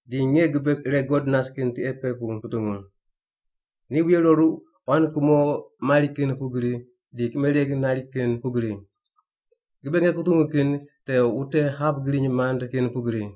Di nge gibe ire God nas kin tiqe pe pu kutungu. Ni wuye roru quan kumo mari kin pugri di kimereg nari kin pugri. Gibe nge kutungu kin te wute hap griny mand kin pugri.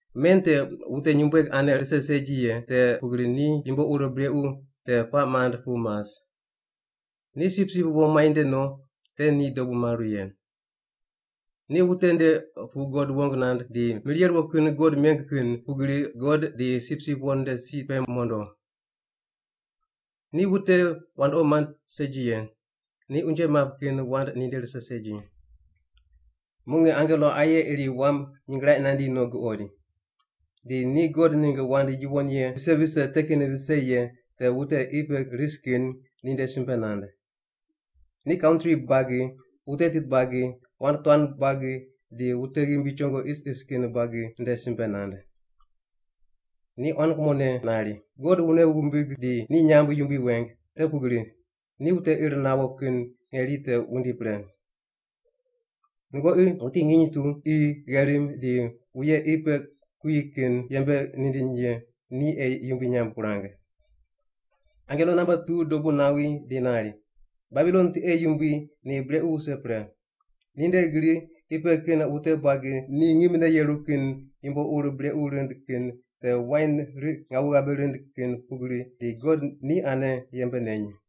Men te wute nyumbueg ane rise segi ye, te pugri ni yumbo ur brequ te puaq mand pu mas. Ni Sipsip Wo muainde no te ni dobu maru ye. Ni wute nde pu God wong nand di mir ye ruwo kin God meng kin pugri God di Sipsip Wo nde si pe mondo. Ni wute wandoqi mand segi ye, ni unje map kin wand ninde rise segi. Muq nge angelo aye iri wam nyingraiq nandi no guqoid. Di ni God ningg wand yuwon ye vise vise te kin vise ye te wute qi pe ris kin ninde simbe nand. Ni kantri buagi, wute tit buagi, wand tuan buagi di wute ghimbi chongo isis kin buagi nde simbe nand. Ni quan kumone nari, “God wune wumbig di ni nyamb yumbui weng, te pugri ni wute ir nawo kin ngeri te wundi pre. Nungoqi wuti nginy tu, qi, gherim di wuye qi pe kuyi kin yembe nindiny ye ni ei yumbui nyamb wurang.” Angelo namba tu dobu nawi di nari, “Babilon tiqe yumbui ni brequ wuse pre! Ninde gri qi pe kin wute buagi ni ngimne yeru kin yumbo ur brequ rind kin te wain riq ngawu ghabe rind kin pugri di God ni ane yembe neny.”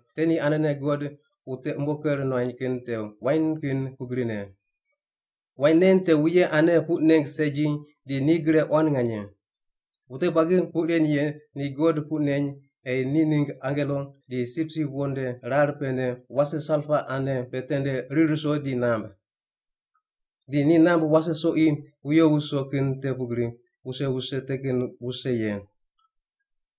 te ni anene God wute umbo ker nuany kin te wain kin pugri ne. Wain nen te wuye ane puq neng segi di ni gre quan nganye. Wute buagi puq ren ye ni God puq neny ei ni ningg angelo di Sipsip Wo nde rar pene wase salpa ane pe tende rir ruso di namb. Di ni namb wase soqi wuyo wuso kin te pugri wuse wuse te kin wuse ye.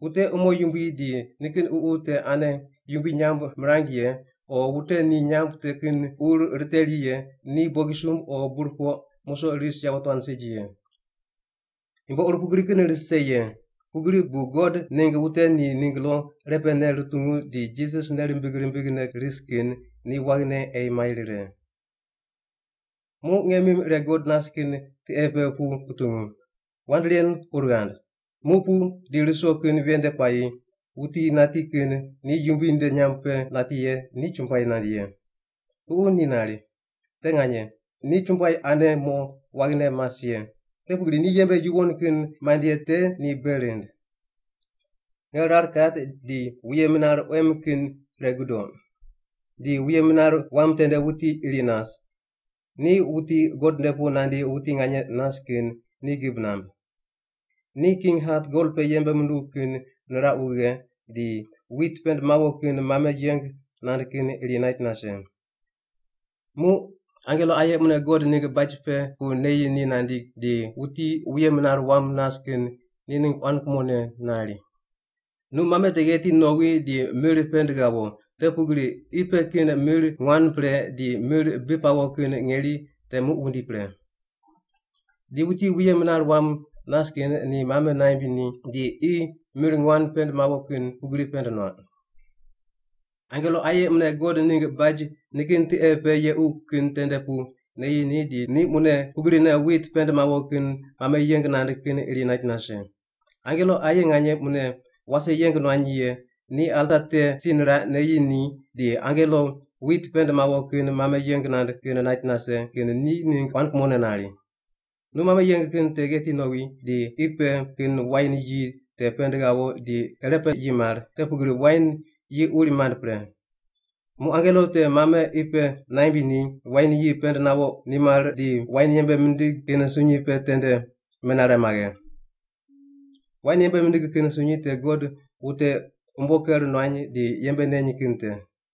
Wute umo yumbui di nikin ququ te ane yumbui nyamb mirany ye o wute ni nyamb te kin ur riteri ye ni bogisumb o burpoq musoq ris yawotuan segi ye.” Yumbo ur pugri kin rise ye, pugri bu God ningg wute ni ningg lo irepene rutungu di Jisas nei rimbig rimbigne ris kin ni waghine ei mai rire. Muq nge mim ire God nas kin tiqe pe pu kutungu, “Wand ren ur ghand: Muq pu di ruso kin ven nde puayi wuti nati kin ni Yumbui nde nyamb pe nati ye ni chumbuai nand ye.” Ququ ni nari, “Te nganye. Ni chumbuai ane mo waghine mas ye, te pugri ni yembe yuwon kin mand ye te ni bei rind.” Nge rar kat di wuye minar quem kin ire gudoq, di wuye minar wam tende wuti iri nas, ni wuti God nde pu nandi wuti nganye nas kin ni gib namb. Ni king hat gol pe yembe munduw kin niraq wughe di wit pend mawo kin mame yeng nand kin iri nait nase. Muq angelo aye mune God ningg baj pe pu neyi ni nandi di wuti wuye minar wam nas kin ni ningg quan kumone nari, “Nu mame te gheti nowi di mir pend ghawo, te pugri qi pe kin mir nguan pre di mir bi pawo kin ngeri te muq wundi pre.” Di wuti wuye minar wam nas kin ni mame naimb ni di qi mir nguan pend mawo kin pugri pend nuaq. Angelo aye mune God ningg baj nikin tiqe pe yequ kin tende pu neyi ni di ni mune pugrine wit pend mawo kin mame yeng nand kin iri nait nase. Angelo aye nganye mune wase yeng nuany ye ni alta te si niraq neyi ni di angelo wit pend mawo kin mame yeng nand kin nait nase kin ni ningg quan kumone nari, “Nu mame yeng kin te gheti nowi di qi pe kin wain yi te pend ghawo di irepe yi mar, te pugri wain yi uri mand pre.” Muq angelo te mame qi pe naimb ni wain yi pend nawo nimar di wain yembe mindig kin sunyi pe tende menare maghe. Wain yembe mindig kin sunyi te God wute umbo ker nuany di yembe neny kin te.